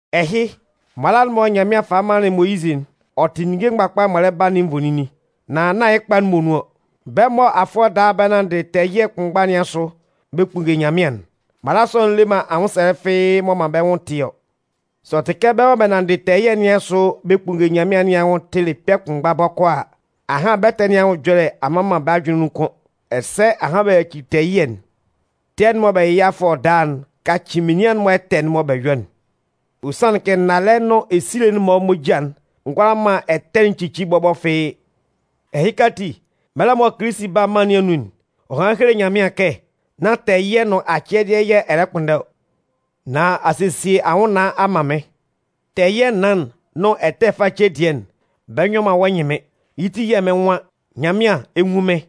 Ɛhɩ, mala'n mɔ Nyanmɩan falɩ manlɩn Moyizɩ'n, ɔ tɩ ninnge mgbakpa'n m'ɔ lɛ ba nɩn nvoninnin, nan nán yɩ́ kpa'n muonun ɔ. Bɛ́ mɔ afʋɛ daa bɛ nanndɩ tɛɛ ɛyɩɛ kʋnmgba nɩn asʋ bɛ kpunnge Nyanmɩan'n, mala sɔ'n le man anwʋnsɛlɛ fɩ́ɩ́ m'ɔ man bɛ́ nwʋn tɩ ɔ. Sɛ ɔ tɩ kɛ bɛ́ mɔ bɛ nanndɩ tɛɛ ɛyɩɛ nɩn asʋ bɛ kpunnge Nyanmɩan nɩn anwʋn tɩlɩ kpɛ̂ kʋnmgba bɔkɔɔ a, ahan bɛ́ ɛtɛ nɩn anwʋn ɛjɔlɛ a mma man bɛ́ ajʋnlɩn nun kʋ́n, ɛsɛ ahan bɛ yacili tɛɛ ɛyɩɛ'n. Tɛɛ'n mɔ bɛ yɩ yɩ́ afʋɛ daa'n kacɩ menian'n-mɔ ɛtɛ'n mɔ bɛ yɔ'n. Ɔ sanlɩn kɛ nnalɛ nʋn esile'n-mɔ moja'n ngʋala man ɛtɛ'n cici bɔbɔ fɩ́ɩ́. Ɛhɩka ati, mɛlɛ mɔ Kilisi 'ba mân nɩn anun'n, ɔ hanlɩn helelɩ Nyanmɩan kɛ: Nán tɛɛ ɛyɩɛ nʋn acɛdɩɛ yɛ̂ ɛ lɛ kpʋnndɛ ɔ. Nan a sesie anwʋnnaan a man mɩ́n. Tɛɛ ɛyɩɛ naan'n nʋn ɛtɛ face dɩɛ'n, bɛ nyɔ man wɔ́ ɛnyɩnmɩn. Yɩ́ ti yɛ̂ mɩ́n nwan: Nyanmɩan, ɛ 'nwun mɩ́n.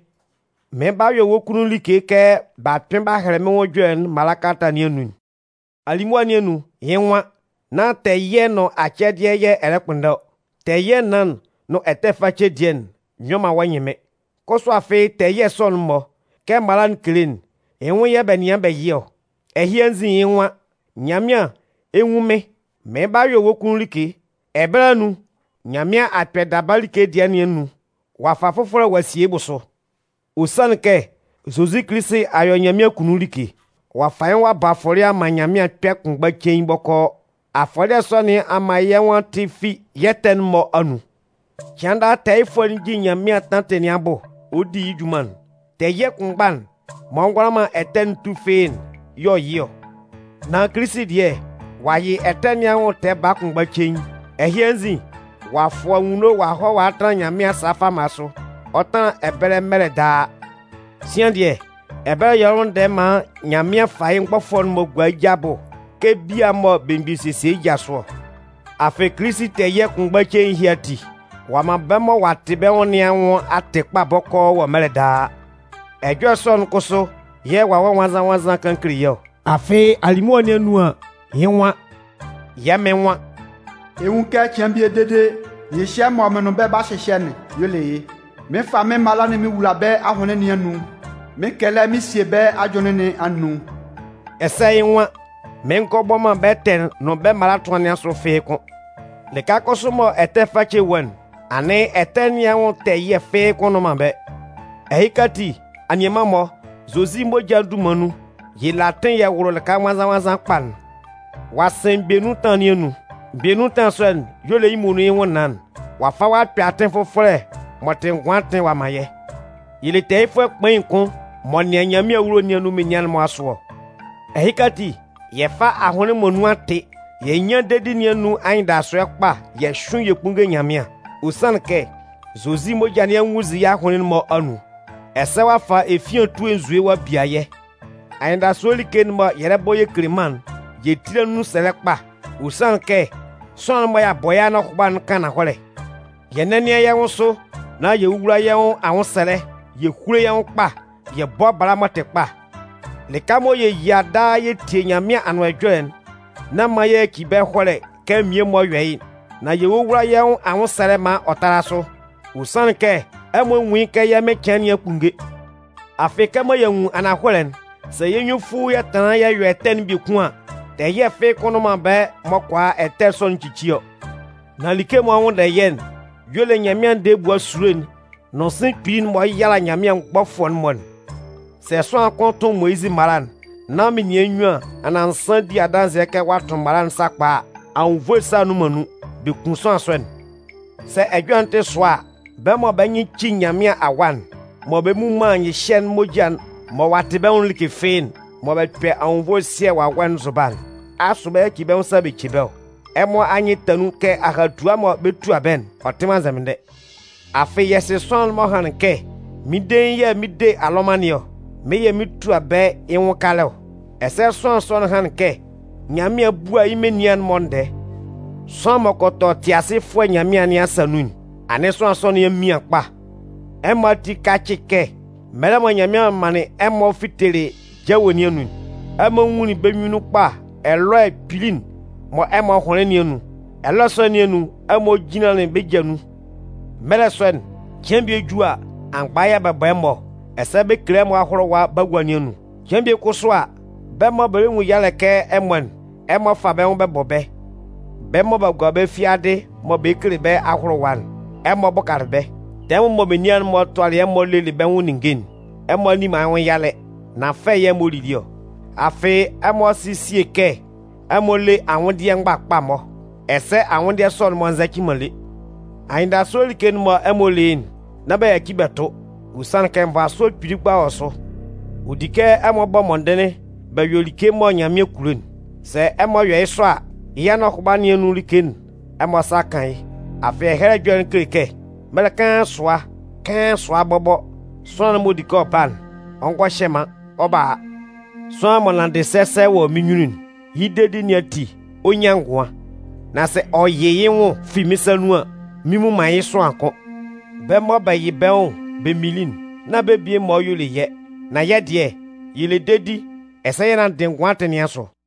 Mɩɩn ba mɩn yɔ wɔ́ kʋnnun like kɛ b'a kpɩn b'a hɛlɛ mɩ́n nwʋn ɛjɔlɛ'n mala kalata nɩn anun'n. Alimʋa nɩn anun, yɩ́ nwan: Nán tɛɛ ɛyɩɛ nʋn acɛdɩɛ yɛ̂ ɛ lɛ kpʋnndɛ ɔ. Tɛɛ ɛyɩɛ naan'n nʋn ɛtɛ face dɩɛ'n nyɔ man wɔ́ ɛnyɩnmɩn. Kʋsʋ afɩ tɛɛ ɛyɩɛ sɔ'n-mɔ, kɛ mala'n kele'n, yɩ́ nwʋn yɛ̂ bɛ nɩan bɛ yɩ ɔ. Ɛhɩ anzin, yɩ́ nwan: Nyanmɩan, ɛ 'nwun mɩ́n. Mɩɩn ba mɩn yɔ wɔ́ kunnun like. Ɛbɛlɛ anun, Nyanmɩan a kpɛ daba like dɩɛ nɩn anun ɔ'a fa fʋfɔlɛ ɔ'a sie yɩ́ bʋsʋ. Ɔ sanlɩn kɛ Zozi Kilisi a yɔ Nyanmɩan akunnun like. Ɔ'a fa yɩ́ nwʋn ɔ'a bɔ afɔlɩɛ a man Nyanmɩan kpɛ̂ kʋnmgba cein bɔkɔɔ. Afɔlɩɛ sɔ nɩn a man yɛ́ nwʋn a tɩ fi yɛ́ ɛtɛ'n-mɔ anun. Cɩan daa tɛɛyɩfʋɛ'n jin Nyanmɩan tantɩ nɩn abʋ ɔ di yɩ́ junman'n. Tɛɛ ɛyɩɛ kʋnmgba'n m'ɔ ngʋala man ɛtɛ'n tu fɩ́ɩ́'n y'ɔ yɩ ɔ. Nan Kilisi dɩɛ, ɔ'a yɩ ɛtɛ nɩn anwʋn tɛɛ baa kʋnmgba cein. Ɛhɩ anzin, ɔ'a fʋ anwunno ɔ'a hɔ a tanlan Nyanmɩan asa fama sʋ. Ɔ 'tanlan ɛbɛlɛ mɛlɛ daa. Sian dɩɛ, ɛbɛlɛ y'ɔ lɛ nwʋnndɛ maan Nyanmɩan fa yɩ́ mgbɔfʋɛ'n-mɔ gua yɩ́ ja abʋ kɛ bia mɔ belemgbin sesie yɩ́ ja sʋ ɔ. Afɩ Kilisi tɛɛ ɛyɩɛ kʋnmgba cein ɛhɩ ati, ɔ'a man bɛ́ mɔ ɔ'a tɩ bɛ́ nwʋn nɩn anwʋn a tɩ kpa bɔkɔɔ wɔ mɛlɛ daa. Ɛjɔlɛ sɔ'n kʋsʋ yɛ̂ Wawɛ Nwannzan-nwannzan kan kele yɛ́ ɔ. Afɩ alimʋa nɩn anun an, yɩ́ nwan: Yɛ́ Mɩn nwan: Ɛ 'nwun kɛ cɩan bie dede nyɩhyɛ'n mɔ mɩn nʋn bɛ́ yɛ 'ba hyɩhyɛ'n 'yɔ yɩ́'n. Mɩn 'fa mɩ́n mala'n mɩn wula bɛ́ ahʋnlɩn nɩn anun, mɩn 'kɛlɛ mɩn sie bɛ́ ajʋnlɩn nɩn anun. Ɛsɛ yɩ́ nwan: Mɩn ngɔ bɔ man bɛ́ ɛtɛ'n nʋn bɛ́ mala ɛtʋan nɩn asʋ fɩ́ɩ́ kʋ́n. Lɩka kʋsʋ mɔ ɛtɛ face wɔ'n, anɩn ɛtɛ nɩn anwʋn tɛɛ ɛyɩɛ fɩ́ɩ́ kʋ́n nnʋn man ɛbɛlɛ. Ɛhɩka ati, anianman-mɔ, Zozi moja'n dunman nun, yɛ le atɩn yɛ wʋlʋ lɩka nwannzan-nwannzan kpa'n. Ɔ'a sɩn mgbɛ nun ɛtanlan nɩn anun. Mgbɛ nun ɛtanlan sɔ'n y'ɔ le yɩ́ muonun yɩ́ nwʋnnaan'n. Ɔ'a fa ɔ'a kpɛ atɩn fʋfɔlɛ m'ɔ tɩ ngʋan atɩn ɔ'a man yɛ́. Yɛ le tɛɛyɩfʋɛ kpain kʋn m'ɔ nɩan Nyanmɩan awulo nɩn anun menian'n-mɔ asʋ ɔ. Ɛhɩka ati, yɛ fá ahʋnlɩn mɔ nun a tɩ, yɛ nyán dedi nɩn anun anyɩndasʋɛ kpa yɛ hyʋ́ɩn yɛ kpúnnge Nyanmɩan. Ɔ sanlɩn kɛ Zozi moja nɩn a nwunnzin yɛ́ ahʋnlɩn'n-mɔ anun. Ɛsɛ ɔ'a fa efian etue nzue ɔ'a bia yɛ́. Anyɩndasʋɛ like'n mɔ yɛ lɛ bɔ yɛ kele mân'n, yɛ tíla nun sɛlɛ kpa. Ɔ sanlɩn kɛ sʋanlan'n mɔ ɔ'a bɔ yɛ́ anɔhʋba'n kan ananhɔlɛ. Yɛ nɛ́nɩan yɛ́ nwʋn sʋ nán yɛ wówula yɛ́ nwʋn anwʋnsɛlɛ yɛ húlo yɛ́ nwʋn kpa, yɛ bɔ́ bala m'ɔ tɩ kpa. Lɩka mɔ yɛ yia daa yɛ tie Nyanmɩan Anʋan Ɛjɔlɛ'n, nán man yɛ yaci ɛbɛlɛ ɛhɔlɛ kɛ mmie-mɔ yɔ yɩ́'n. Nan yɛ wówula yɛ́ nwʋn anwʋnsɛlɛ maan ɔ tála sʋ, ɔ sanlɩn kɛ ɛmɔ nwun yɩ́ kɛ yɛ́ Mɩn cɩan nɩn a kpunnge. Afɩ kɛmɔ y'a nwun ananhɔlɛ'n, sɛ yɛ́ nyunnunfuu yɛ tanlan yɛ yɔ ɛtɛ'n biekun an, tɛɛ ɛyɩɛ fɩ́ɩ́ kʋ́n nnʋn ɛbɛlɛ m'ɔ kʋala ɛtɛ sɔ'n cici ɔ. Nan like mɔ ɔ 'nwʋnndɛ yɛ́'n y'ɔ le Nyanmɩan ndɛɛ ebua esulo'n nʋn sɩ̂n kpili'n mɔ ɔ 'yala Nyanmɩan mgbɔfʋɛ'n-mɔ'n. Sɛ sʋanlan kʋn tʋn Moyizɩ mala'n nán menian nyuan anan nsan di adanzɩɛ kɛ ɔ'a tʋn mala'n sakpa a, anwunnvoe ɛsa nnʋn man nun, bɛ kun sʋanlan sɔ'n. Sɛ ɛjɔlɛ'n tɩ sʋa a, bɛ́ mɔ bɛ́ nyɩn ci Nyanmɩan Awa'n, mɔ bɛ mmu man nyɩhyɛ'n moja'n mɔ ɔ'a tɩ bɛ́ nwʋn'n like fɩ́ɩ́'n, mɔ bɛ kpɛ anwunnvoe ɛsɩɛ Wawɛ'n nzʋba'n, asʋ bɛ 'yaci bɛ́ nwʋn sa bɛ ce bɛ́ ɔ? Ɛmɔ anyɩn ta nun kɛ ahatua mɔ bɛ 'tua bɛ́'n, ɔ tɩ man nzɛmɩndɛ. Afɩ yɛ sɩ sʋanlan'n m'ɔ hanlɩn kɛ: Mɩ́n dein yɛ̂ mɩn 'de alɔman nɩn ɔ. Mɩ́n yɛ̂ mɩn 'tua bɛ́ yɩ́ nwʋn kalɛ ɔ. Ɛsɛ sʋanlan sɔ'n hanlɩn kɛ: Nyanmɩan 'bua yɩ́ menian'n-mɔ ndɛɛ. Sʋanlan m'ɔ kɔ tɔ Tɩasɩfʋɛ Nyanmɩan nɩn asa nun'n, anɩn sʋanlan sɔ nɩn a mian kpa. Ɛmɔ ati kácɩ kɛ mɛlɛ mɔ Nyanmɩan manlɩn ɛmɔ fitelɩ jawe nɩn anun'n, ɛmɔ nwunlin bɛ́ nyunnun kpa ɛlɔɛ kpili'n mɔ ɛmɔ hʋnlɩn nɩn anun. Ɛlɔɛ sɔ nɩn anun, ɛmɔ jinlanlɩn bɛ́ ja nun. Mɛlɛ sɔ'n, cɩan bie ju a, amgba yɛ̂ bɛ bɔ ɛmɔ, ɛsɛ bɛ kele ɛmɔ ahʋlʋwa bagua nɩn anun. Cɩan bie kʋsʋ a, bɛ́ mɔ bɛ lɛ nwun yalɛ kɛ ɛmɔ'n, ɛmɔ fa bɛ́ nwʋn bɛ bɔ bɛ́. Bɛ́ mɔ b'a gua bɛ́ fiadɩ mɔ bɛ kele bɛ́ ahʋlʋwa'n, ɛmɔ bʋkalɩ bɛ́. Tɛmʋn mɔ menian'n-mɔ tʋalɩ ɛmɔ lelɩ bɛ́ nwʋn ninnge'n, ɛmɔ a nni man yɩ́ nwʋn yalɛ, nan fɛ yɛ ɛmɔ lili ɔ. Afɩ ɛmɔ sɩ sie kɛ ɛmɔ le anwʋndɩɛ mgbakpa-mɔ. Ɛsɛ anwʋndɩɛ sɔ'n-mɔ nzɛcɩ man lé. Anyɩndasʋɛ like'n mɔ ɛmɔ le yɩ́'n, nán bɛ yaci bɛ tʋ. Ɔ sanlɩn kɛ nvasʋɛ kpili kpa wɔ sʋ. Ɔ di kɛ ɛmɔ bɔ mɔndɩnlɩn bɛ yɔ like mɔ Nyanmɩan kulo'n. Sɛ ɛmɔ yɔ yɩ́ sɔ a, yɩ́ anɔhʋba nɩn anun like'n, ɛmɔ asa 'kan yɩ́. Afɩ Ɛhɛlɛ Ɛjɔlɛ'n kele kɛ: Mɛlɛ kaan sʋa, kaan sʋa bɔbɔ, sʋanlan'n m'ɔ di kɛ ɔ ba'n, ɔ ngɔ hyɛ man, ɔ 'ba a. Sʋanlan m'ɔ nanndɩ sɛsɛ wɔ mɩ́n nyunnun'n, yɩ́ dedi nɩn ati, ɔ 'nyan ngʋan. Nan sɛ ɔ yɩ yɩ́ nwʋn fi mɩ́n sa nun an, mɩn mmu man yɩ́ sʋanlan kʋ́n. Bɛ́ mɔ bɛ yɩ bɛ́ nwʋn bɛ minlin'n, nán bɛ́ mmie-mɔ y'ɔ le yɛ́. Nan yɛ́ dɩɛ, yɛ le dedi, ɛsɛ yɛ nanndɩ ngʋan atɩn nɩn asʋ.